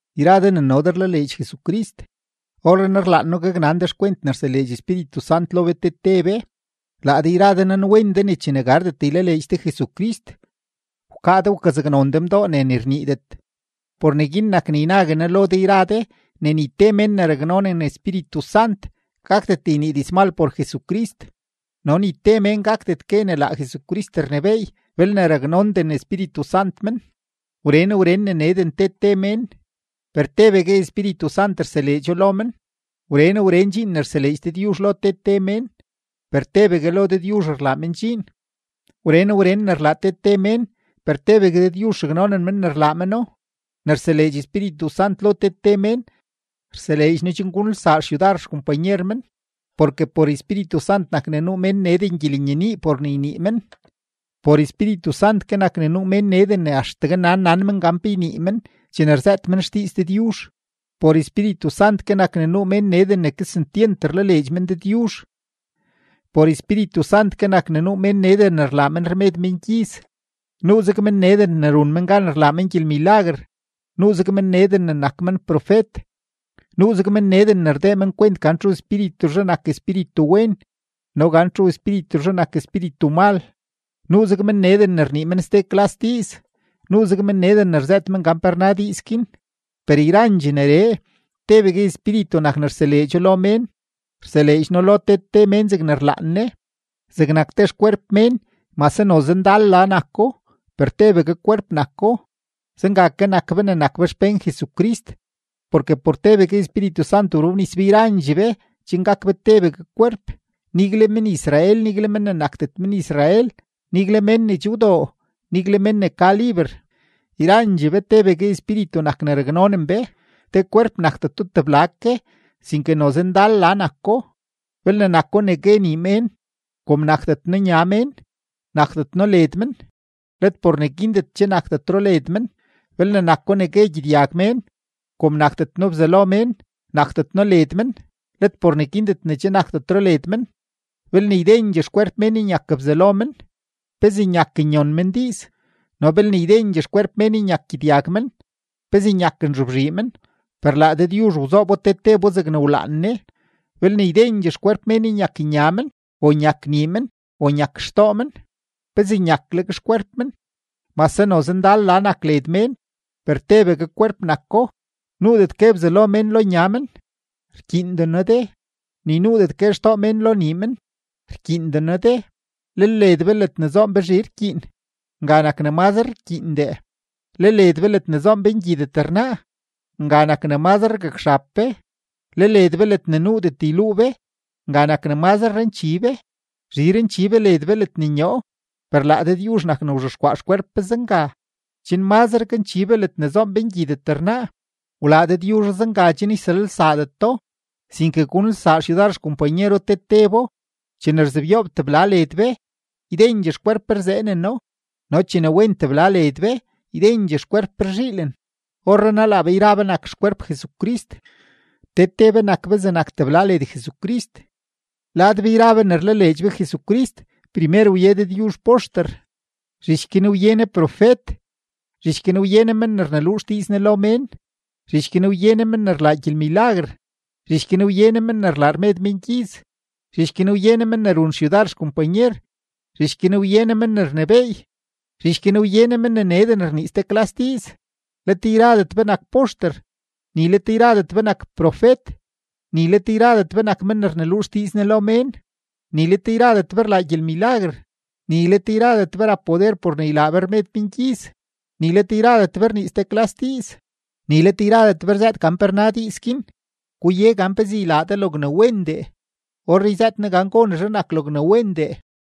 Yra de ne no de rlaleedx Jesucrist, orrenaa rlaan noo gaknan de xkwent ne rseleedx Espíritu Sant lo be te te be. Laa de yra de nanwen de ne chene gardet ylaleedx de Jesucrist, wkaa de wkazaknon de mdoo ne ni rniidet. Por neguin nak ne ynague noo lo de yra de ne ni te mén ne raknonen Espíritu Sant gakdet ynii dizmal por Jesucrist, no ni te mén gakdet gue ne laa Jesucrist rnebééy belne raknonden Espíritu Sant men. Wren wren ne neden te te mén, per tebegue Espíritu Sant rseleedxo lo men. Wren wren dxiin rseleedx Dëdyuzh lo te te mén, per tebegue lo Dëdyuzh rlaa men dxiin. Wren wren ne rlaa te te mén, per tebegue Dëdyuzh raknonen men ne rlaa meno. Ne rseleedx Espíritu Sant lo te te mén, rseleedx No chen gunelsaa xyudar xkompanyer men. Porke por Espíritu Sant nak ne nuu mén neden gyelenyenii por ne ynii men, por Espíritu Sant ke nak ne nuu mén neden ne axtegue nan nan men gan pe ynii men chene rzëët men xdiiz Dëdyuzh, por Espíritu Sant ke nak ne nuu mén neden ne kesentyent rlaleedx men Dëdyuzh, por Espíritu Sant ke nak ne nuu mén neden ne rlaa men rmed mengyiz. Nuuzeg men neden ne run men gan rlaa men gyelmilaguer, nuuzeg men neden ne nak men profet, nuuzeg men neden ne rdee men kwent gan txu Espírituzhe nak Espíritu wen no gan txu espírituzhe nak espíritu mal, nuuzeg men neden ne rnii men ste klas diiz, nuuzeg men neden ne rzëët men gan pe rna diiz guin. Per yrandxee neree, tebegue Espíritu nak ne rseleedxo lo mén, rseleedx No lo te te mén zegne rlaan Ne. Zegnak te xkwerp mén, mase noze ndal la nako, per tebegue kwerp nako, zenga ke nak be ne nak be xpén Jesucrist. Porke por tebegue Espíritu Sant wrobnis be yrandxee be chen gak be tebegue kwerp, nigle men-Israel, nigle mén ne nakdet men-Israel, nigle mén ne che wdoo, nigle mén ne ka liber; yrandxee be tebegue Espíritu nak ne raknonen be. Te kwerp nakdeto tebla ke, sinke noze ndal la nako. Belne nako ne gue nii mén: “Kom nakdet noo nya mén, nakdet noo led men”, let por neguindet che nakdetro led men. Belne nako ne gue gyedyag mén: “Kom nakdet noo bzalo mén, nakdet noo led men”, let por neguindet che nakdetro led men. Belne ydendxee xkwerp mén nyak bzalo men, ¿pezee nyak nyon men diiz? No belne ydendxee xkwerp mén nyak gyedyag men, ¿pezee nyak nzobzhii men? Per laa Dëdyuzh wzoobo te tebo zegne wlaan Ne. Belne ydendxee xkwerp mén nyak nya men o nyak nii men o nyak xtoo men, ¿pezee nyakleg xkwerp men? Mase noze ndal la nak led mén, per tebegue kwerp nako. Nuudet gue bzalo mén lo nya men: “Rkyiinden noo de”; ni nuudet gue xtoo men lo nii men: “Rkyiinden noo de.” Lel led be ledne zoon be zhi rkyiin, nga nak ne mazre rkyiindee; le led be ledne zoon be ngyidet rnaa, nga nak ne mazre rgakxab be; le led be ledne nuudet yluu be, nga nak ne mazre ranchi be; zhi ranchi be led be ledne nyoo. Per laa Dëdyuzh nak ne wzhexkwaa xkwerp be zenga, chen mazre ganchi be ledne zoon be ngyidet rnaa. Wlaa Dëdyuzho zenga, chen yselalsaadeto, sinke gunelsaa xyudar xkompanyero te tebo. Chene rzebyoob tebla led be, ydendxee xkwerp be rzeeneno; no chene wen tebla led be, ydendxee xkwerp be rzhiilen. Orrenaa laa be yra be nak xkwerp Jesucrist, te te be nak be zegnak tebla led Jesucrist. Lad be yra be ne rlaleedx be Jesucrist, primer wye Dëdyuzh poxter, zhich guin wye Ne profet, zhich guin wye Ne men ne rneluu xdiiz Ne lo mén, zhich guin wye Ne men ne rlaa gyelmilaguer, zhich guin wye Ne men ne rlaa rmed mengyiz, zhich guin wye Ne men ne run xyudar xkompanyer, zhich guin wye Ne men ne rnebééy, zhich guin wye Ne men ne neden rnii ste klas diiz. Let yradet be nak poxter, ni let yradet be nak profet, ni let yradet be nak men ne rneluu xdiiz Ne lo mén, ni let yradet be rlaa gyelmilaguer, ni let yradet be rap poder por ne ylaa be rmed mengyiz, ni let yradet be rnii ste klas diiz, ni let yradet be rzëët gan pe rna diiz guin. Guye gan pezee ylaa de logne wendee. Orree yzëët noo gan gonezhe nak logne wendee.